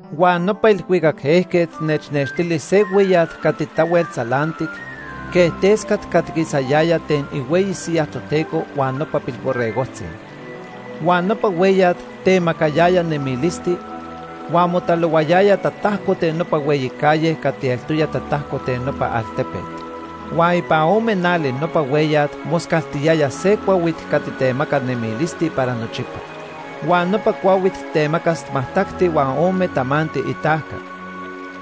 Huan nopa ilhuicac ejquet nechnextili se hueyat cati tahuel tzalantic quej tescat cati quisayaya ten ihueyi siyaj Toteco huan nopa Pilborregojtzi. Huan nopa hueyat temacayaya nemilisti, huan motalohuayaya tatajco ten nopa hueyi calle cati eltoya tatajco ten nopa altepet. Huan ipan ome nali nopa hueyat moscaltiyaya se cuahuit cati temaca nemilisti para nochipa. Huan nopa cuahuit temacas majtacti huan ome tamanti itajca,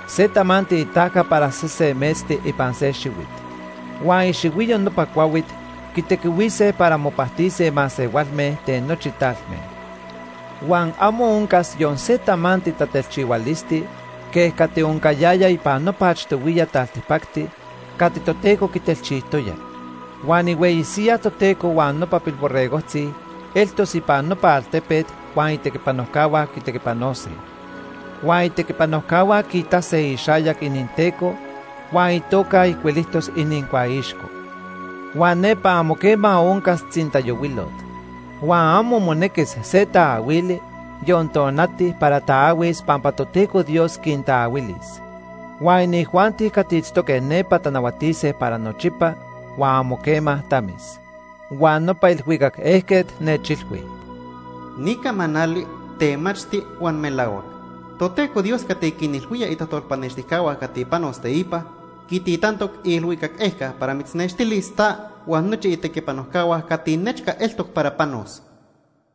se tamanti itajca para sese metzti ipan se xihuit. Huan ixihuiyo nopa cuahuit quitequihuise para mopajtise masehualme ten nochi talme. Huan amo oncas yon se tamanti tatelchihualisti quej cati oncayaya ipan nopa achtohuiya taltipacti cati Toteco quitelchijtoya. Huan ihueyi siyaj Toteco huan nopa Pilborregojtzi eltos ipan nopa altepet huan itequipanojcahua quitequipanose. Huan itequipanojcahua quiitase ixayac ininTeco huan itoca ijcuilijtos inincuaixco. Huan nepa amo quema oncas tzintayohuilot. Huan amo monequis se taahuili, yon tonati para taahuis pampa Toteco Dios quintaahuilis. Huan inijuanti cati itztoque nepa tanahuatise para nochipa huan amo quema tamis. Huan nopa ilhuicac ejquet nechilhui: “Ni camanali temachti huan melahuac. Toteco Dios cati quinilhuía itajtolpanextijcahua cati panos teipa, quititantoc iilhuicac ejca para mitznextilis ta huan nochi itequipanojcahua cati nechca eltoc para panos.”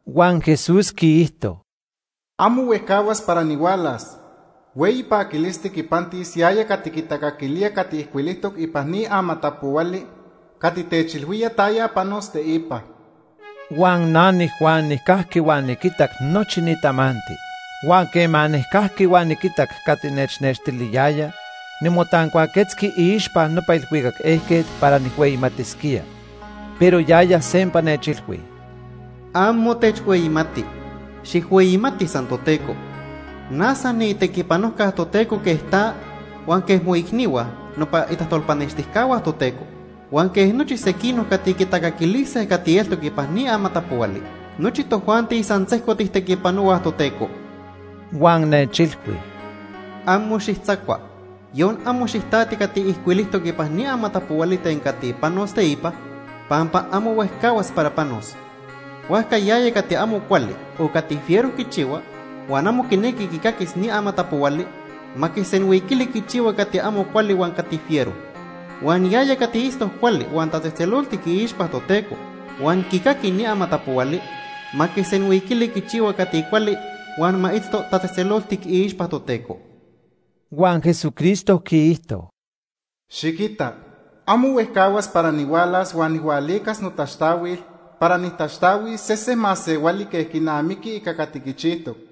Huan Jesús quiijto: “Amo huejcahuas para nihualas. Hueyi paquilisti quipantis yaya cati quitacaquilía cati ijcuilijtoc ipan ni amatapohuali cati techilhuía taya panos teipa.” Huan na niJuan nijcajqui huan niquitac nochi ni tamanti. Huan quema nijcajqui huan niquitac cati nechnextiliyaya, nimotancuaquetzqui iixpa nopa ilhuicac ejquet para nijhueyimatisquía. Pero yaya sempa nechilhui: “Amo techhueyimati. Xijhueyimati san Toteco. Na san niitequipanojca Toteco quej ta, huan quej moicnihua, nopa itajtolpanextijcahua Toteco, huan quej nochi sequinoc cati quitacaquilise cati eltoc ipan ni amatapohuali. Nochi tojuanti san sejco tijtequipanohuaj Toteco.” Huan nechilhui: “Amo xijtzacua, yon amo xijtati cati ijcuilijtoc ipan ni amatapohuali ten cati panos teipa pampa amo huejcahuas para panos. Huajca yaya cati amo cuali o cati fiero quichihua, huan amo quinequi quicaquis ni amatapohuali, ma quisenhuiquili quichihua cati amo cuali huan cati fiero. Huan yaya cati itztoc cuali huan tatzejtzeloltic iixpa Toteco huan quicaqui ni amatapohuali, ma quisenhuiquili quichihua cati cuali huan ma itzto tatzejtzeloltic iixpa Toteco.” Huan Jesucristo quiijto: “Xiquita amo huejcahuas para nihualas huan nijhualicas notaxtahuil para nijtaxtahuis sese masehuali quej quinamiqui ica cati quichijtoc.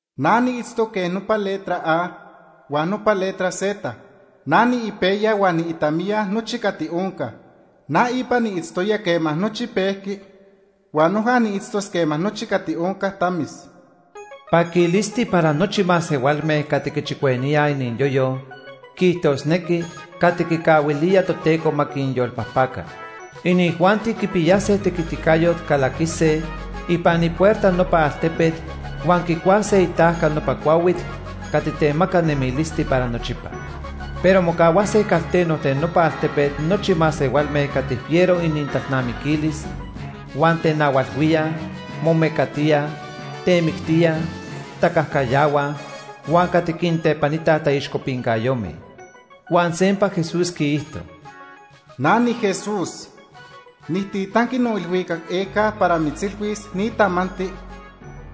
Na niitztoc quej nopa letra A huan nopa letra Z. Na niipejya huan niitamiya nochi cati onca. Na ipa niitztoya quema nochi pejqui huan noja niitztos quema nochi cati onca tamis.” Paquilisti para nochi masehualme cati quichicueníaj iniyoyo, quiijtosnequi, cati quicahuilía Toteco ma quinyolpajpaca. Inijuanti quipiyase tequiticayot calaquise ipan ipuerta nopa altepet huan quicuase itajca nopa cuahuit cati temaca nemilisti para nochipa. Pero mocahuase calteno ten nopa altepet nochi masehualme cati fiero inintalnamiquilis, huan tenahualhuíaj, momecatíaj, temictíaj, tacajcayahuaj huan cati quintepanitaj taixcopincayome. Huan sempa Jesús quiijto: “Na niJesús, nijtitanqui noilhuicac ejca para mitzilhuis ni tamanti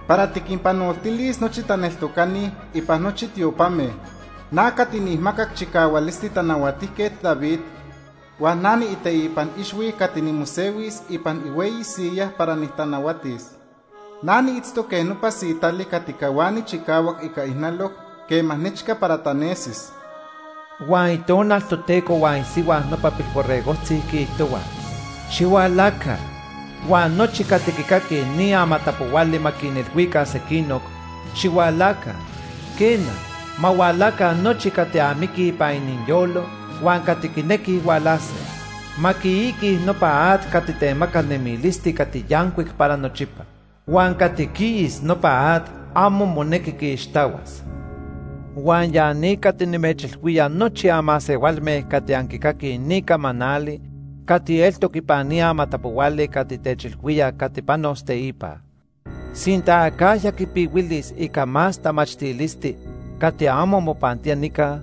para tiquinpanoltilis nochi taneltocani ipan nochi tiopame. Na cati nijmacac chicahualisti Tanahuatijquet David huan na niiteipan ixhui cati nimosehuis ipan ihueyi siyaj para nitanahuatis. Na niitztoc quej nopa sitali cati cahuani chicahuac ica ijnaloc quema nechca para tanesis.” Huan Itonal Toteco huan isihua nopa Pilborregojtzi quiijtohuaj: “Xihualaca.” Huan nochi cati quicaquij ni amatapohuali ma quinilhuica sequinoc: “Xihualaca.” Quena, ma hualaca nochi cati amiquij ipan iniyolo huan cati quinequij hualase. Ma quiiquij nopa at cati temaca nemilisti cati yancuic para nochipa. Huan cati quiis nopa at amo monequi quiixtahuas. Huan ya ni cati nimechilhuía nochi anmasehualme cati anquicaquij ni camanali cati eltoc ipan ni amatapohuali cati techilhuía cati panos teipa. Sinta acajya quipihuilis ica más tamachtilisti cati amo mopantía nica,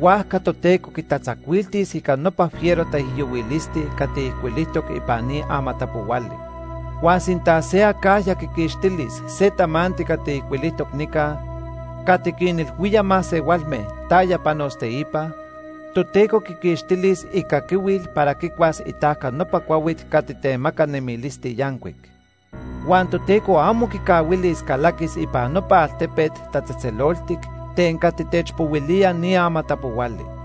huajca Toteco quitatzacuiltis ica nopa fiero taijyohuilisti cati ijcuilijtoc ipan ni amatapohuali. Huan sinta se acajya quiquixtilis se tamanti cati ijcuilijtoc nica cati quinilhuía masehualme taya panos teipa, Toteco quiquixtilis icaquihuil para quicuas itajca nopa cuahuit cati temaca nemilisti yancuic. Huan Toteco amo quicahuilis calaquis ipan nopa altepet tatzejtzeloltic ten cati techpohuilía ni amatapohuali.